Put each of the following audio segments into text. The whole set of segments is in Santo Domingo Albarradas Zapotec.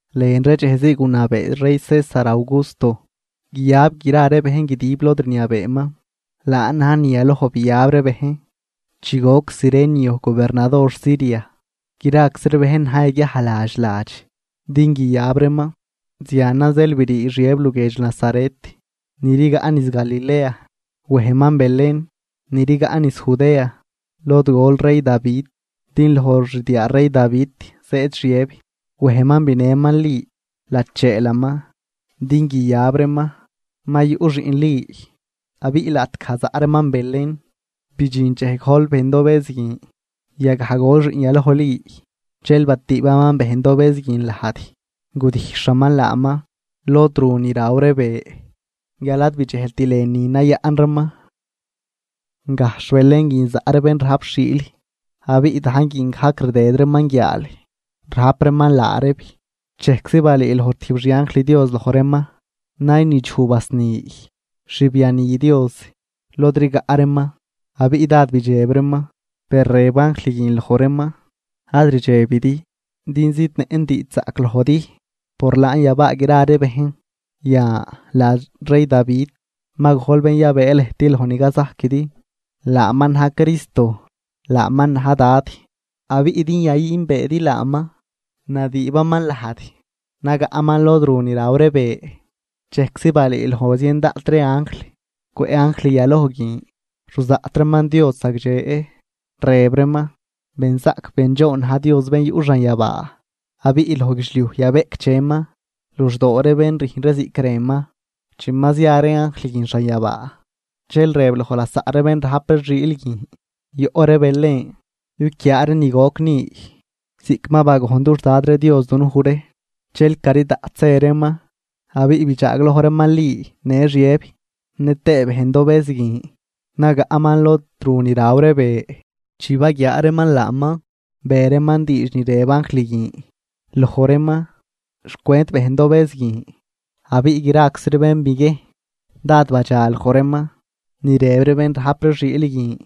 Lën ree dxejzii gunabee rey César Augusto guiyab gra ree bejn guidib lod rniabeeman. Laan na̱j ni yaloj biyab ree bejn chi goc Cirenio gobernador Siria. Graczi ree bejn na̱j yaguiaj ladx ladx din guiyab reeman. Zianan zeel brii Xiëb luguiedx Nazaret ni rigaꞌ niz Galilea, wejman Belén, ni rigaꞌ niz Judea, lod gol rey Davi din loj xdiaa rey Davi zëëd Xiëb. Wejman binëman Li, lacheelaman din guiyab reeman. Ma yuꞌ xiꞌn Li. Abiꞌ laꞌtgaj zaꞌ reeman Belén, bidxin dxej gojl bejndobëz guin. Yagaj gol xiꞌn yaloj Li, dxel batüübaman bejndobëz guin lajd, gudijxhaman laaman lod ru ni raw ree be, guial ad bidxejlt lënü nayaꞌn reeman. Gajxh Belén guin zaꞌ ree bén rajp xiil, abiꞌ dajn guin gajc rdëd reeman guiaal rajp reeman laa reeb. Dxejczi balüüloj tijb xianjl Dios loj reeman, naynidxuj basni xbiani Dios lod rigaꞌ reeman abiꞌ dád bidxeb reeman. Per rëb anjl guin loj reeman: ―Ad rdxebidi din zidnëꞌn diidxzaꞌc lojdi, por laan yabaa gra ree bejn. Yan, ladx rey Davi ma gojl bén yabëë lëjt loj ni cazajquidi, laaman na̱j Cristo, laaman na̱j Dad. Abiꞌ din yayünbeedi laaman; nadüübaman lajd, nagaꞌman lod ru ni raw ree be. Dxejczi balüüloj zien daꞌt ree anjl cwëꞌ anjl yaloj guin, ruzaꞌt reeman Dios zagdxe, rëb reeman: ¡Benzaꞌc bendxoon na̱j Dios bén yuꞌ xanyabaa, abiꞌ loj guidxliuj yabeꞌcdxeman luxdoo bén rüjn ree ziꞌc rënman! Chi ma zia ree anjl guin xanyabaa, dxel rëb loj lasaꞌ ree bén rajp ree xiil guin: ―Yoꞌ ree Belén yuquiaa ree ni goc ni, ziꞌc ma bagojn dux Dad ree Dios dunuj ree. Dxel cari daꞌt zë reeman, abiꞌ bidxaagloj reeman Li në Xiëb, nëtëë bejndobëz guin nagaꞌman lod ru ni raw ree be. Chi baguiaa reeman laaman, be reeman diidx ni rëb anjl guin loj reeman xcwent bejndobëz guin, abiꞌ graczi ree bén biguiejn dád badxa loj reeman ni rëb ree bén rajp ree xiil guin.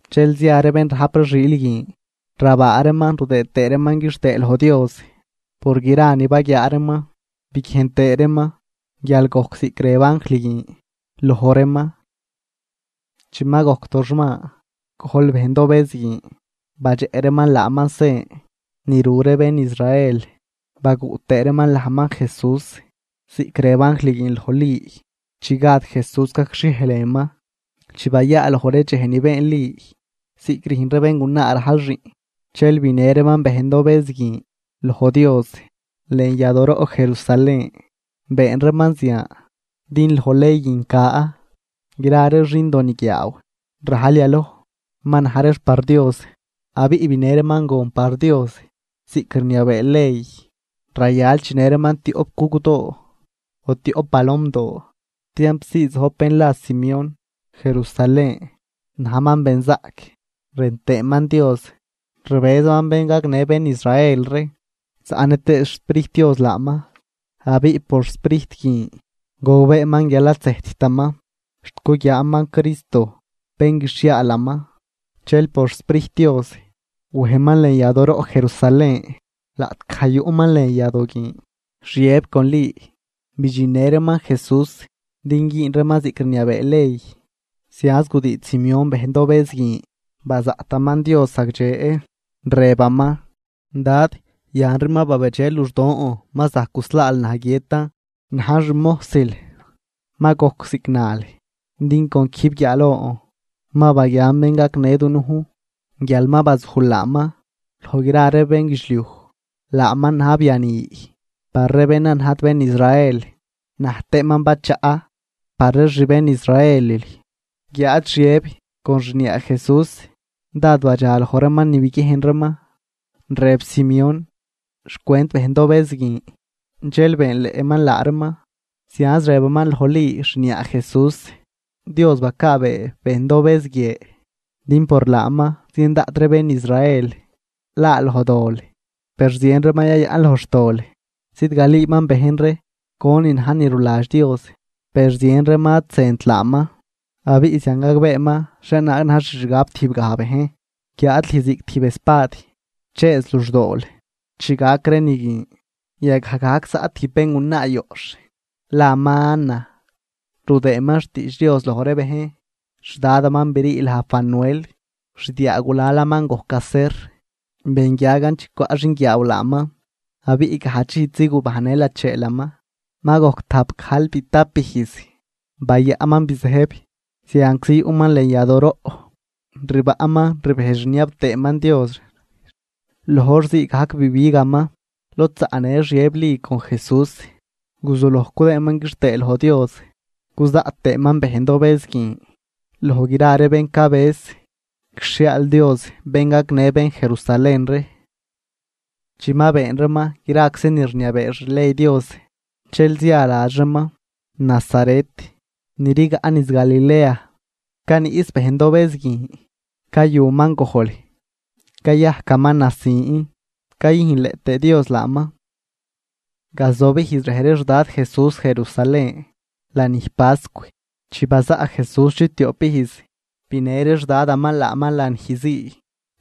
Dxel zia ree bén rajp ree xiil guin, rabaa reeman rudëë tëë reeman quixtëë loj Dios por gra ni baguiaa reeman biguiejn tëë reeman, guial gojc ziꞌc rëb anjl guin loj reeman. Chi ma gojc toxman gojl bejndobëz guin, badxeꞌ reeman laaman sen ni ru ree bén Israel, baguꞌ tëë reeman lajman Jesús ziꞌc rëb anjl guin loj Li chi gad Jesús gacxhiej lënman. Chi bayaaloj ree dxej ni been Li ziꞌc rüjn ree béngunaa rajl xiꞌn, dxel binë reeman bejndobëz guin loj Dios lën yadooroꞌ Jerusalén. Been reeman zian din loj ley guin ca: “Gra ree xindoniguiaaw rajl yaloj ma na̱j reex par Dios.” Abiꞌ binë reeman gon par Dios ziꞌc rniabee ley: rayal chinë reeman tioꞌp gugdoo o tioꞌp palomdoo. Tiamp zii zojb bén la Simeón Jerusalén. Najman benzaꞌc rën tëëman Dios, rbëzaman bén gagnë bén Israel ree zaꞌnë tëë xSprijt Dios laaman. Abiꞌ por Sprijt guin gogbeeman guial ad zëjttaman xt guguiaaman Cristo, bén guixhiaalaman. Dxel por xSprijt Dios wejman lën yadooroꞌ Jerusalén. Laꞌtgaj yuꞌman lën yadoo guin, Xiëb con Li bidxinnë reeman Jesús din güün reeman ziꞌc rniabee ley, zianz gudiidx Simeón bejndobëz guin bazaꞌtaman Dios zagdxe, rëbaman: Dad, yanri ma babedxe luxdon. Ma zajc guslaal naj guiëtan najn xmojsil, ma gojc ziꞌc nal. Din con quijb guiaalon ma baguian bén gagnë dunujn. Guial ma bazujl laaman loj gra ree bénguidxliuj. Laaman na̱j biani par ree bén ad najt bén Israel, na̱j tëëman bachaꞌ par ree xbén Israelil. Guiáad Xiëb con xniaa Jesús dád badxa loj reeman ni biguiejn reeman rëb Simeón xcwent bejndobëz guin. Dxel beenleꞌman laa reeman, zianz rëbaman loj Li xniaa Jesús: ―Li, Dios bacaabee bejndobëz guie din por laaman zien daꞌt ree bén Israel laa loj dol, per zien reeman yayaꞌn loj xtol. Zidgalüüman bejn ree conin na̱j ni ruladx Dios, per zien reeman ad zënt laaman. Abiꞌ zian gagbeeman xhienaag na̱j xixgab tijbgaj bejn, guiáad lüj ziꞌc tijb espad chëëz luxdool chi gac ree ni guin. Yagaj gajc zaꞌ tijb béngunaa yoꞌxh laman Ana, rudëëman xtiidx Dios loj ree bejn, xdadaman brii laj Fanuel, xdiaagulalaman gojc Aser. Benguiagan chi cwaꞌ xinguiaaw laaman, abiꞌ gajdx ijsi gubajnnë lacheelaman. Ma gojc tajpgajlbitap ijz bayaꞌnman bizëjb. Zianczi yuꞌman lën yadooroꞌ, rbaꞌnman rbejdx rniab tëëman Dios. Loj hor ziigajc bibigaman lod zaꞌnë Xiëb Li con Jesús, guzuloj cudëëdaman quixtëë loj Dios cuzaꞌt tëëman bejndobëz guin loj gra ree bén cabëz guixhiaal Dios bén gagnë bén Jerusalén ree. Chi ma been reeman graczi ni rniabee xley Dios, dxel zia ladx reeman Nazaret ni rigaꞌ niz Galilea. Caniꞌs bejndobëz guin, cayuman gojl, cayajcaman nasin, cayüjnleꞌ tëë Dios laaman. Gazob ijz rej ree xdad Jesús Jerusalén lanij pascw. Chi bazaꞌ Jesús chiptioꞌp ijz, binë ree xdadaman laaman lanij zii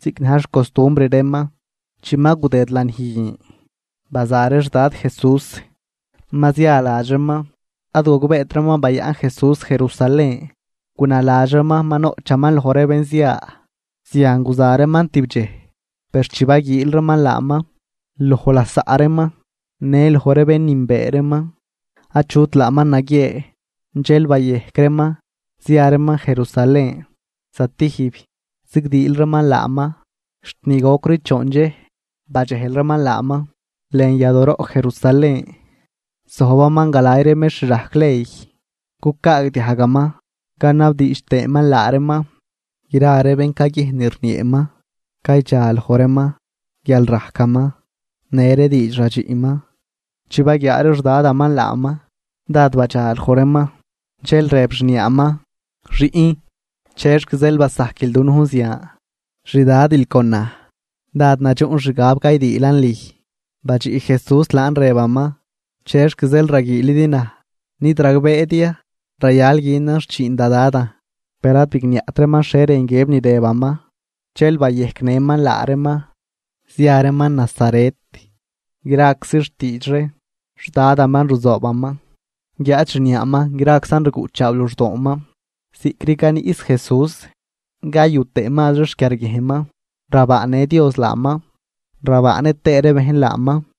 ziꞌc na̱j xcostumbr reeman. Chi ma gudëd lanij guin, baza ree xdad Jesús ma zia ladx reeman. Ad gogbeet reeman bayaꞌn Jesús Jerusalén. Gunaladx reeman ma noꞌchaman loj ree bén zia. Zian guza reeman tibdxej. Per chi baguiil reeman laaman loj lasaꞌ reeman në loj ree bén nünbee reeman, achut laaman naguiee. Dxel bayejc reeman zia reeman Jerusalén zatijb zigdiil reeman laaman. Xt ni gocri choon dxej badxejl reeman laaman lën yadooroꞌ Jerusalén, zojbaman galay ree mextr rajc ley, cucaagdiajgaman canabdiidx tëëman laa reeman. Gra ree bén caguiejn ni rnieeman caydxaloj reeman guial rajcaman në ree diidx radxiꞌman. Chi baguiaa ree xdadaman laaman, dád badxaloj reeman, dxel rëb xniaaman: ―Xiꞌn, ¿chexc zeel basajquil dunujn zian? Xdadil con naj dád nadxuꞌn xgab caydiilan lüj. Badxiꞌ Jesús laan rëbaman: ―¿Chexc zeel raguiilidi naj? ¿Nid ragbeedi ya rayal günan xchiin da Dadan? Per ad bigniaꞌt reeman xhie rën guiëb ni rëbaman. Dxel bayejcnëman laa reeman zia reeman Nazaret, graczi xtiidx ree xdadaman ruzoobaman, guiáad xniaaman graczan rguꞌchaaw luxdooman. Ziꞌcri caniꞌs Jesús cayu tëë mazri xquiarguiejnman. Rabaanë Dios laaman rabaanë tëë ree bejn laaman.